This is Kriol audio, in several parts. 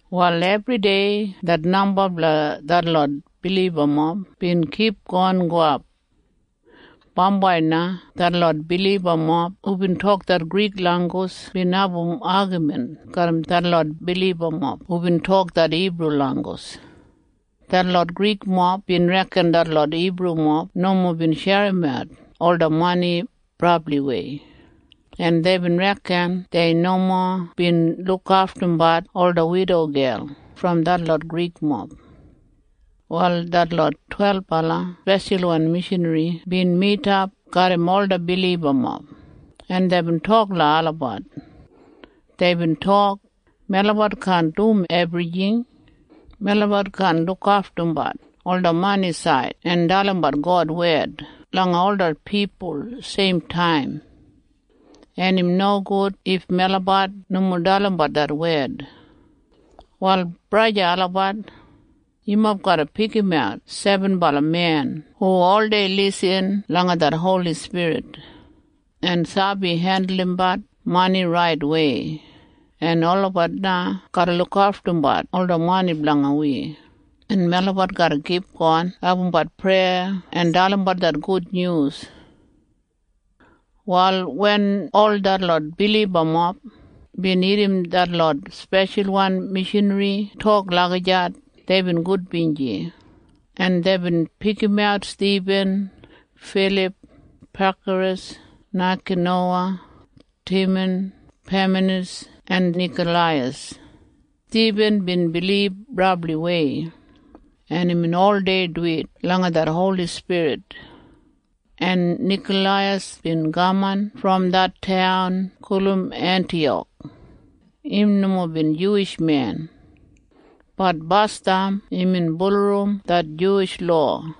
Wal ebridei det namba blanga detlot bilibamob bin kipgon gowap. Bambai na detlot bilibamob hubin tok det Grik langgus bin abum agamin garram detlot bilibamob hubin tok det Hibru langgus. Detlot Grikmob bin reken detlot Hibrumob nomo bin sherimat ola mani brabliwei, en deibin reken dei nomo bin lukaftumbat ola widogel brom detlot Grikmob. Wal detlot twelbala speshalwan mishanri bin midap garram ola bilibamob, en deibin tok langa olabat. Deibin tok, “Melabat kaan dum ebrijing. Melabat kaan lukaftumbat ola manisaid en dalimbat God wed langa ola pipul seimtaim, en im nogud if melabat nomo dalimbat det wed. Wal main braja en sista olabat, yumob garra pikimat sebenbala men hu oldei lisin langa det Holi Spirit en sabi hendulumbat mani raitwei, en olabat na garra lukaftumbat ola mani blanga wi, en melabat garra kipgon abumbat preya en dalimbat det gudnyus.” Wal wen ol detlot bilibamob bin irrim detlot speshalwan mishanri tok lagijat, deibin gudbinji, en deibin pikimat Stibin, Filip, Prakaras, Naikanowa, Timan, Pamenas en Nikoleiyas. Stibin bin bilib brabliwei, en imbin oldei duwit langa det Holi Spirit. En Nikoleiyas bin kaman brom det taun gulum Entiyak. Im nomo bin Juwish men. Bat basdam imbin bulurrum det Juwish lowa,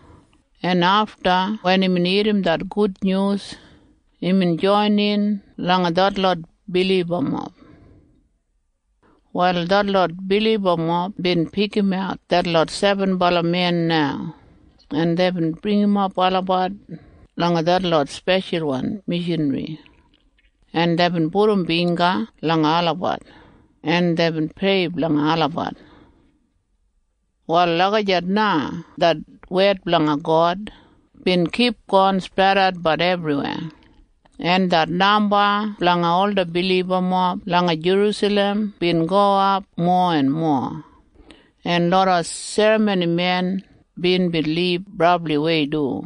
en afta wen imbin irrim det gudnyus, imbin joinin langa detlot bilibamob. Wal detlot bilibamob bin pikimat detlot sebenbala men na, en deibin bringimap olabat langa detlot speshalwan mishanri, en deibin pudum bingga langa olabat, en deibin prei blanga olabat. Wal lagijat na det wed blanga God bin kipgon spredatbat ebriweya, en det namba blanga ola bilibamob langa Jerusalem bin gowap mowa en mowa, en loda serramonimen bin bilib brabliwei du.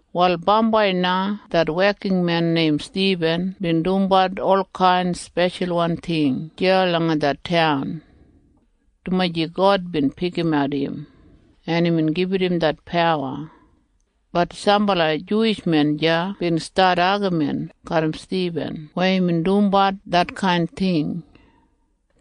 Wal bambai na det wekinmen neim Stibin bin dumbat olkain speshalwan ting deya langa det taun, dumaji God bin pikimat im, en imbin gibit im det pawa. Bat sambala Juwish men deya bin stat agamin garram Stibin weya imbin dumbat detkain ting.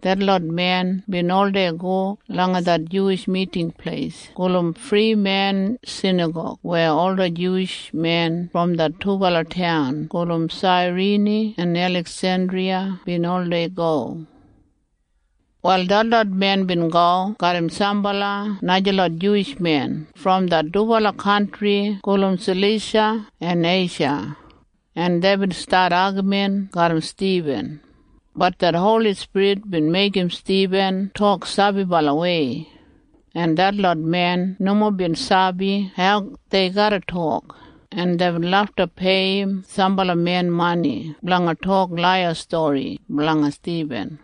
Detlot men bin oldei go langa det Juwish Miting Pleis gulum Frimen Sinagog weya ola Juwish men brom det dubala taun gulum Sairini en Eliksendriya bin oldei go. Wal detlot men bin go garram sambala najalot Juwish men brom det dubala kantri gulum Salisha en Eisha, en deibin stat agamin garram Stibin. Bat det Holi Spirit bin meigim Stibin tok sabibalawei, en detlot men nomo bin sabi hau dei garra tok, en deibin lafta peiyim sambala men mani blanga tok laiya stori blanga Stibin,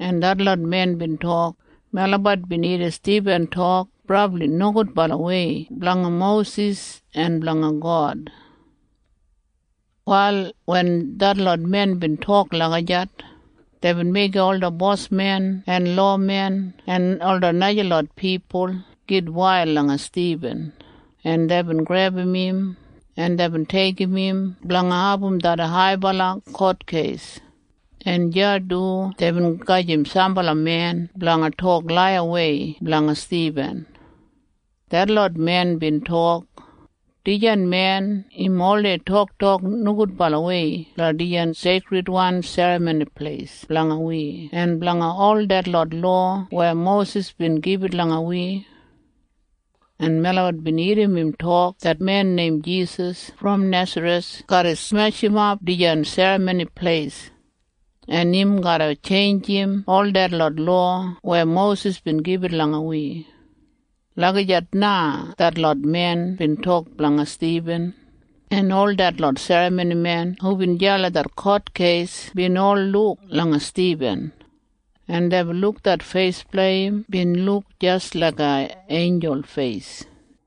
en detlot men bin tok, “Melabat bin irrim Stibin tok brabli nogudbalawei blanga Mosis en blanga God.” Wal wen detlot men bin tok lagijat, deibin meigim ola bosmen en lowamen en ola najalot pipul gitwail langa Stibin, en deibin grebum im, en deibin deigim im blanga abum det haibala kotkeis, en deya du deibin gedim sambala men blanga tok laiyawei blanga Stibin. Detlot men bin tok, “Dijan men im oldei toktok nogudbalawei blanga dijan seikridwan Serramoni Pleis blanga wi en blanga ol detlot lowa weya Mosis bin gibit langa wi. En melabat bin irrim im tok det men neim Jisas brom Nesareth garra smeshimap dijan Serramoni Pleis, en im garra tjeinjim ol detlot lowa weya Mosis bin gibit langa wi.” Lagijat na detlot men bin tok blanga Stibin, en ol detlot serramonimen hubin deya langa det kotkeis bin ol luk langa Stibin, en deibin luk det feis blanga im bin luk jis laiga einjul feis.